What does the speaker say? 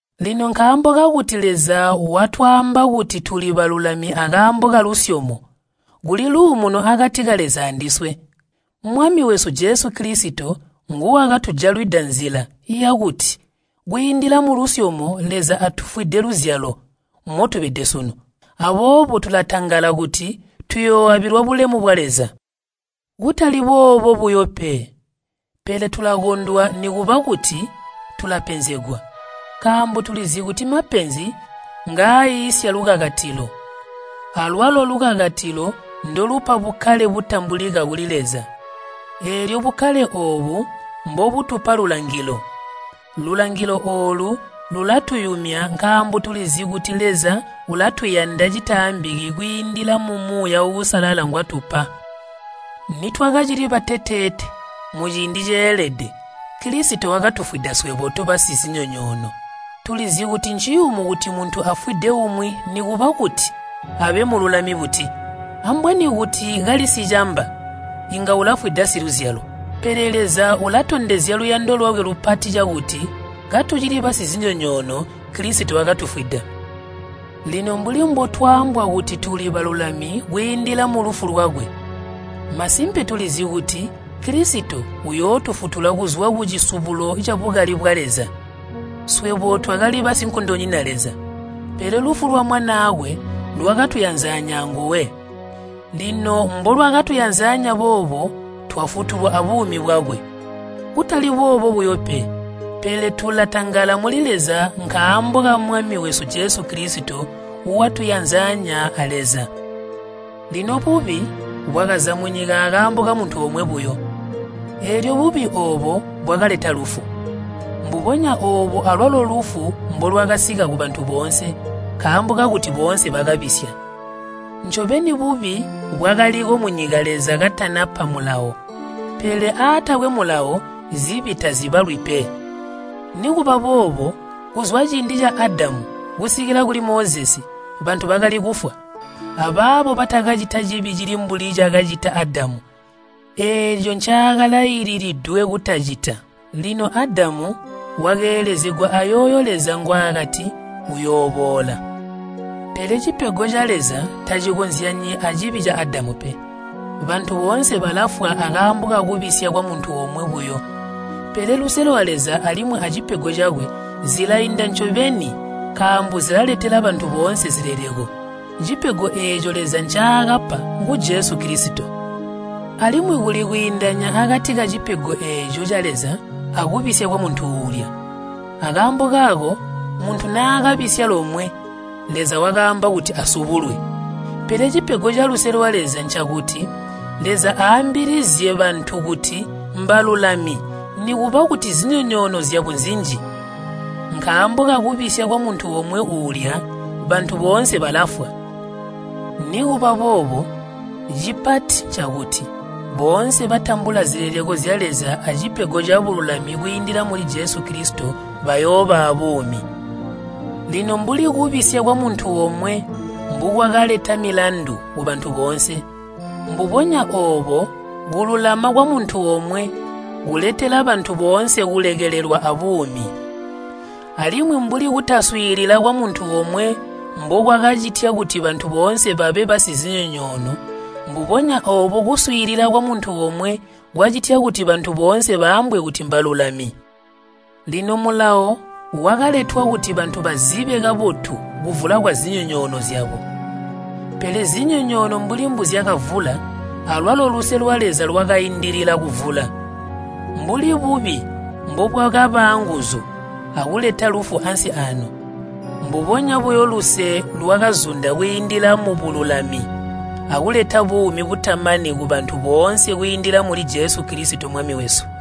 Lino nkaambo kakuti Leza watwaamba kuti tuli balulami akaambo kalusyomo, kuli luumuno akati ka Leza andiswe. Mwami wesu Jesu Kilisito nguwakatujalwida nzila yakuti kwiindila mulusyomo Leza atufwide luzyalo motubede sunu. Aboobo tulatangala kuti tuyooabilwa bulemu bwa Leza. Kutali boobo buyo pe, pele tulakondwa nikuba kuti tulapenzegwa, nkaambo tulizi kuti mapenzi ngaaiisya lukakatilo. Alwalo lukakatilo ndolupa bukkale butambulika kuli Leza, eelyo bukkale oobu mbobutupa lulangilo. Lulangilo oolu lulatuyumya nkaambo tulizi kuti Leza ulatuyanda citaambiki kwiindila mu Muuya Uusalala ngwatupa. Nitwakacili bateteete, muciindi ceelede, Kilisito wakatufwida swebo tobasizinyonyoono. Tulizi kuti nciyumu kuti muntu afwide umwi nikuba kuti abe mululami buti. Ambweni kuti kali sicamba inga ulafwida siluzyalo. Pele Leza ulatondezya luyando lwakwe lupati cakuti katucili basizinyonyoono Kilisito wakatufwida. Lino mbuli mbotwaambwa kuti tuli balulami kwiindila mulufu lwakwe, masimpe tulizi kuti Kilisito uyootufutula kuzwa kucisubulo cabukali bwa Leza. Swebo twakali basinkondonyina Leza, pele lufu lwa Mwanaakwe lwakatuyanzanya anguwe. Lino mbulwakatuyanzanya boobo twafutulwa abuumi bwakwe. Kutali boobo buyo pe, pele tulatangala muli Leza nkaambo ka Mwami wesu Jesu Kilisito, watuyanzanya a Leza. Lino bubi bwakaza munyika akaambo kamuntu omwe buyo, eelyo bubi oobo bwakaleta lufu. Mbubonya oobo alwalo lufu mbolwakasika kubantu boonse, nkaambo kakuti boonse bakabisya. Ncobeni bubi bwakaliko munyika Leza katanapa Mulawo, pele aatakwe mulawo, zibi tazibalwi pe. Nikuba boobo kuzwa ciindi ca Adamu kusikila kuli Mozesi bantu bakali kufwa, abaabo batakacita cibi cili mbuli cakacita Adamu eeco ncaakalaililidwe kutacita. Lino Adamu wakeelezegwa ayooyo Leza ngwaakati uyooboola. Pele cipego ca Leza tacikozyanyi acibi ca Adamu pe. Bantu boonse balafwa akaambo kakubisya kwamuntu omwe buyo, pele luse lwa Leza alimwi acipego cakwe zilainda ncobeni nkaambo zilaletela bantu boonse zileleko. Cipego eeco Leza ncaakapa ngu Jesu Kilisito. Alimwi kuli kwiindanya akati kacipego eeco ca Leza akubisya kwamuntu uulya. Akaambo kaako muntu naakabisya lomwe, Leza wakaamba kuti asubulwe. Pele cipego caluse lwa Leza ncakuti Leza aambilizye bantu kuti mbalulami nikuba kuti zinyonyoono zyabo nzinji. Nkaambo kakubisya kwamuntu omwe uulya, bantu boonse balafwa, nikuba boobo cipati ncakuti boonse batambula zileleko zya Leza acipego cabululami kwiindila muli Jesu Kilisito, bayooba aabuumi. Lino mbuli kubisya kwamuntu omwe mbukwakaleta milandu kubantu boonse, mbubonya oobo kululama kwamuntu omwe kuletela bantu boonse kulekelelwa abuumi. Alimwi mbuli kutaswiilila kwamuntu omwe mbukwakacitya kuti bantu boonse babe basizinyonyoono mbubonya oobo kuswiilila kwamuntu omwe kwacitya kuti bantu boonse baambwe kuti mbalulami. Lino Mulawo wakaletwa kuti bantu bazibe kabotu kuvula kwazinyonyoono zyabo. Pele zinyonyoono mbuli mbuzyakavula, alwalo luse lwa Leza lwakaindilila kuvula. Mbuli bubi mbubwakaba aanguzu akuleta lufu ansi aano, mbubonya buyo luse lwakazunda kwiindila mubululami, akuleta buumi butamani kubantu boonse kwiindila muli Jesu Kilisito Mwami wesu.